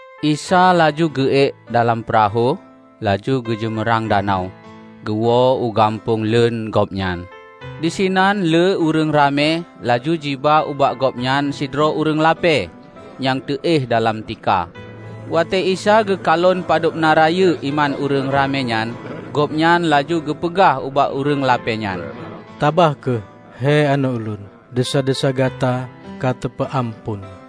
Isa laju geu-ék dalam peurahô, laju geujeumeurang danau, geuwoe u gampông leuen Gobnyan. Disinan lé ureuëng ramé laju jiba ubak Gobnyan sidroe ureuëng lapée nyang teu-éh dalam tika. Watée Isa geukalon padub na rayeuk iman ureuëng ramé nyan, Gobnyan laju geupeugah ubak ureuëng lapée nyan, "Tabah kheueh, he aneuëk Ulôn! Desya-desya gata ka teupeu-amphon."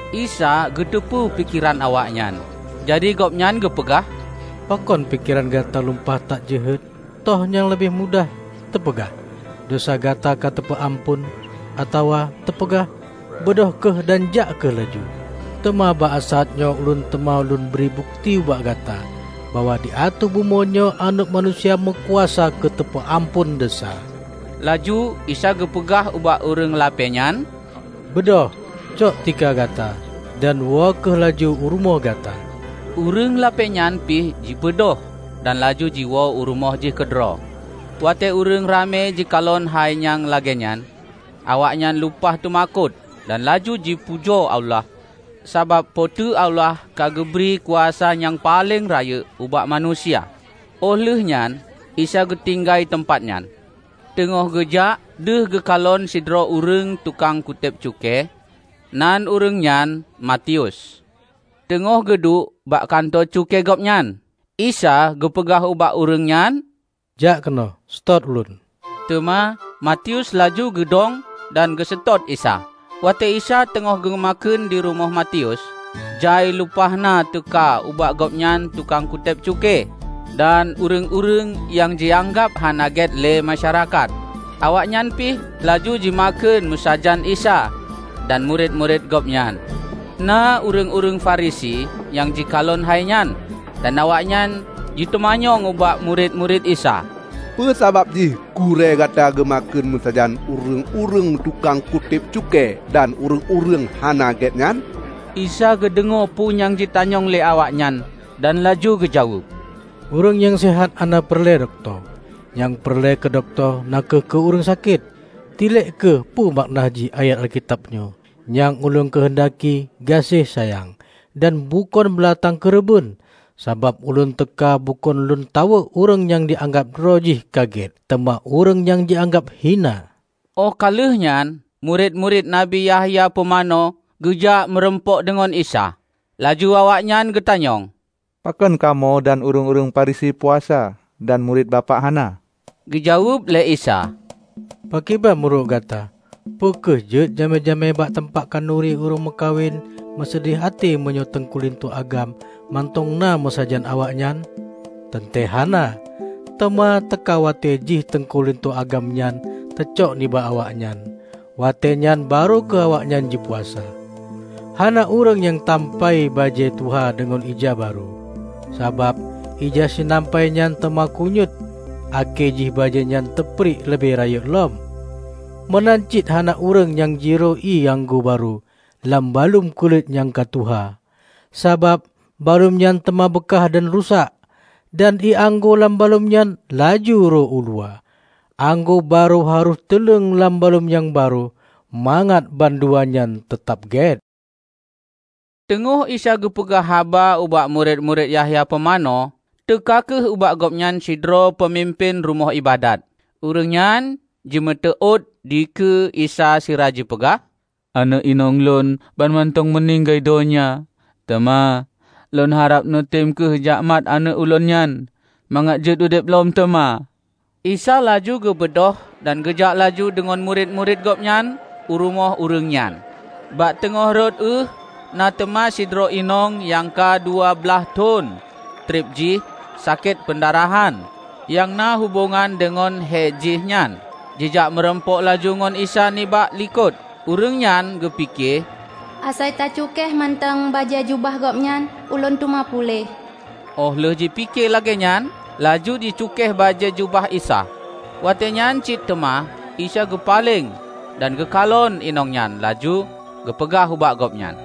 Isa geuteupeue pikeran awaknyan, jadi Gobnyan geupeugah, "Pakon pikeran gata lumpah that jeuhet? Toh nyang leubeh mudah: teupeugah, 'Desya gata ka teupeu-amphon,' atawa teupeugah, 'Beudôh kheueh dan jak kheueh laju'? Teuma bak saát nyoe Ulôn teuma Lôn bri bukeuti ubak gata bahwa di ateueh bumoe nyoe Aneuëk Manusia meukuasa keu teupeu-amphon desya." Laju Isa geupeugah ubak ureuëng lapée nyan, "Beudôh, cok tika gata dan woe kheueh laju u rumoh gata!" Ureuëng lapée nyan pih jibeudôh dan laju jiwoe u rumoh jih keudroe. Watée ureuëng ramé jikalon hai nyang lagée nyan, awaknyan lumpah teumakot dan laju jipujoe Allah, sabab Po teu Allah ka geubri kuasa nyang paleng rayeuk ubak manusia. Óh lheueh nyan Isa geutinggai teumpat nyan. Teungoh geujak, deuh geukalon sidroe ureuëng tukang kutéb cukée, nan ureuëng nyan Matius, teungoh geuduek bak kantô cukée gobnyan. Isa geupeugah ubak ureuëng nyan, "Jak keunoe, seutôt Ulôn!" Teuma Matius laju geudong dan geuseutôt Isa. Watée Isa teungoh geumakheun di rumoh Matius, jai lumpah na teuka ubak Gobnyan tukang kutéb cukée dan ureuëng-ureuëng nyang jianggab hana gét lé masyarakat, awaknyan pih laju jimakheun meusajan Isa dan murit-murit Gobnyan. Na ureuëng-ureuëng Farisi nyang jikalon hai nyan. Dan awaknyan jiteumanyong ubak murit-murit Isa, "Peue sabab jih gurée gata geumakheun meusajan ureuëng-ureuëng tukang kutéb cukée dan ureuëng-ureuëng hana gét nyan?" Isa geudeungoe peue nyang jitanyong lé awaknyan dan laju geujaweueb, "Ureuëng nyang seuhat hana peureulée dokto, nyang peureulée keu dokto na kheueh keu ureuëng sakét. Tilek kheueh peue makna jih ayat Alkitab nyoe: 'Nyang Ulôn keuheundaki gaséh sayang, dan bukon beulatang keureubeuen,' Sabab Ulôn teuka bukon Lôn tawök ureuëng nyang jianggab droe jih ka gét, teuma ureuëng nyang jianggab hina." Óh ka lheueh nyan murit-murit Nabi Yahya pumanö geujak meurumpok deungon Isa. Laju awaknyan geutanyong, "Pakon kamoe dan ureuëng-ureuëng Farisi puasa dan murit Bapak hana?" Geujaweueb lé Isa, "Pakriban meunurot gata? Peu kheueh jeuet jamé-jamé bak teumpat khanuri ureuëng meukawen meuseudeh até meunyoe teungku linto agam mantong na meusajan awaknyan? Teuntée hana! Teuma teuka watée jih teungku linto agam nyan teucok nibak awaknyan. Watée nyan barô kheueh awaknyan jipuasa. Hana ureuëng nyang tampai bajée tuha deungon ija barô. Sabab ija sinampai nyan teuma keunyuet akhé jih bajée nyan teupriek leubeh rayeuk lom. Meunan cit hana ureuëng nyang jiroe ié anggô barô dalam baluem kulét nyang ka tuha. Sabab baluem nyan teuma beukah dan rusak, dan ié anggô lam baluem nyan laju ro uluwa. Anggô barô harôh teuleng lam baluem nyang barô, mangat bandua nyan teutab gét." Teungoh Isa geupeugah haba ubak murit-murit Yahya Pumanö, teuka kheueh ubak Gobnyan sidroe peumimpén rumoh iébadat. Ureuëng nyan jimeuteuôt dikeue Isa sira ji peugah, "Aneuëk inong lôn banmantong meuninggai donya. Teuma, lôn harab neutem kheueh jakmat aneuëk ulôn nyan mangat jeuet udeb lom teuma." Isa laju geubeudôh dan geujak laju deungon murit-murit Gobnyan u rumoh ureuëng nyan. Bak teungoh rot ueh na teuma sidroe inong nyang ka dua blaih thon treb jih sakét peundarahan nyang na hubongan deungon hé jihnyan, jijak meurumpok laju ngon Isa nibak likot. Ureuëng nyan geupike, "Asai ta cukéh mantong bajée jubah Gobnyan, ulôn teuma puléh." Óh lheueh jipike lagée nyan laju jicukéh bajée jubah Isa. Watée nyan cit teuma Isa geupaleng dan geukalon inong nyan laju geupeugah ubak gobnyan,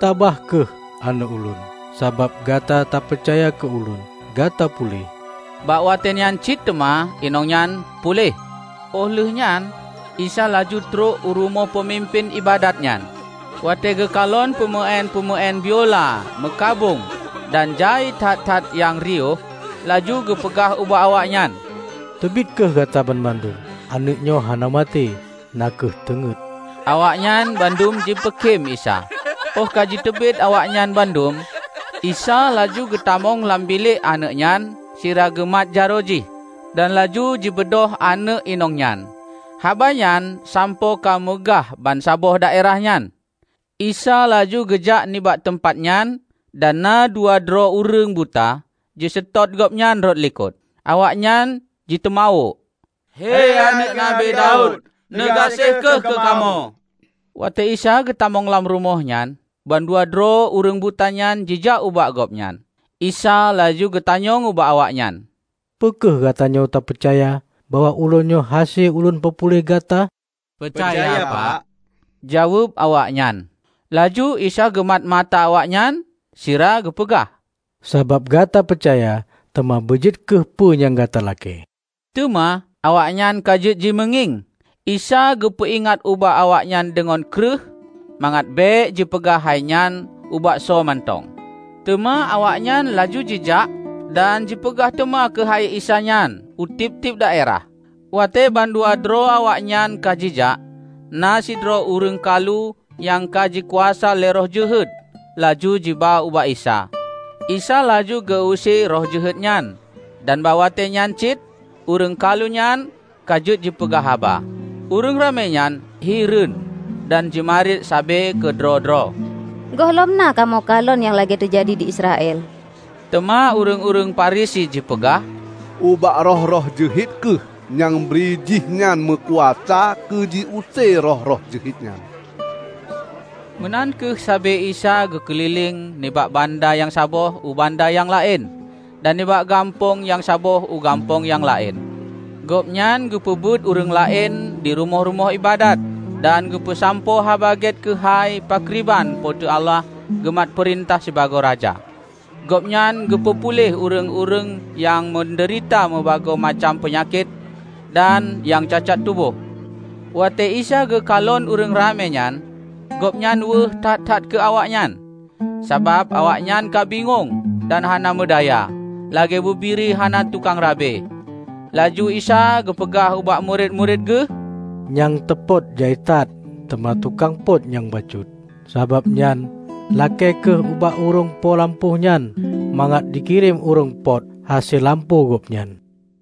"Tabah kheueh, aneuëk Ulôn! Sabab gata tapeucaya keu Ulôn, gata puléh!" Bak watée nyan cit teuma inong nyan puléh. Óh lheueh nyan Isa laju trok u rumoh peumimpén iébadat nyan. Watée geukalon peumeuén-peumeuén biula meukabông dan jai that-that nyang riôh, laju geupeugah ubak awaknyan, "Teubiet kheueh gata banmandum! Aneuëk nyoe hana maté, na kheueh teungét." Awaknyan bandum jipeukém Isa. Óh ka jiteubiet awaknyan bandum, Isa laju geutamong lam bilék aneuëk nyan sira geumat jaroe jih. Dan laju jibeudôh aneuëk inong nyan. Haba nyan sampoe ka meugah bansaboh daerah nyan. Isa laju geujak nibak teumpat nyan dan na dua droe ureuëng buta jiseutôt Gobnyan rot likot. Awaknyan jiteumawök, "He Aneuëk Nabi Daud, neugaséh kheueh keu kamoe!" Watée Isa geutamong lam rumoh nyan, bandua droe ureuëng buta nyan jijak ubak Gobnyan. Isa laju geutanyong ubak awaknyan, "Peu kheueh gatanyoe tapeucaya bahwa Ulôn nyoe hase lôn peupuléh gata?" "Peucaya, Pak!" jaweueb awaknyan. Laju Isa geumat mata awaknyan sira geupeugah, "Sabab gata peucaya, teuma beujeuet kheueh peue nyang gata lakée." Teuma awaknyan ka jeuet jimeungieng. Isa geupeu-ingat ubak awaknyan deungon kreueh, mangat bék jipeugah hai nyan ubak soe mantong. Teuma awaknyan laju jijak dan jipeugah teuma keuhai Isa nyan u tieb-tieb daerah. Watée bandua droe awaknyan ka jijak, na sidroe ureuëng kalu nyang ka jikuasa lé roh jeuhet laju jiba ubak Isa. Isa laju geu-use roh jeuhet nyan dan bak watée nyan cit ureuëng kalu nyan ka jeuet jipeugah haba. Ureuëng ramé nyan hireuen dan jimarit sabe keudroe-droe, "Gohlom na kamoe kalon nyang lagée teujadi di Israel." Teuma ureuëng-ureuëng Farisi jipeugah, "Ubak roh-roh jeuhet kheueh nyang brijihnyan meukuasa keu jiuse roh-roh jeuhet nyan." Meunan kheueh sabe Isa geukeulileng nibak banda nyang saboh u banda nyang laén, dan nibak gampông nyang saboh u gampông nyang laén. Gobnyan geupeubeuet ureuëng laén di rumoh-rumoh iébadat, dan geupeusampoe Haba Gét keuhai pakriban Po teu Allah geumat peurintah sibagoe Raja. Gobnyan geupeu puléh ureuëng-ureuëng nyang meudeurita meubagoe macam peunyakét dan nyang cacat tuboh. Watée Isa geukalon ureuëng ramé nyan, Gobnyan weueh that-that keu awaknyan, sabab awaknyan ka bingong dan hana meudaya, lagée bubiri hana tukang rabe. Laju Isa geupeugah ubak murit-murit Geuh, "Nyang teupot jai that, teuma tukang pot nyang bacut. Sabab nyan lakée kheueh ubak ureuëng po lampôh nyan mangat jikirém ureuëng pot hase lampôh gobnyan."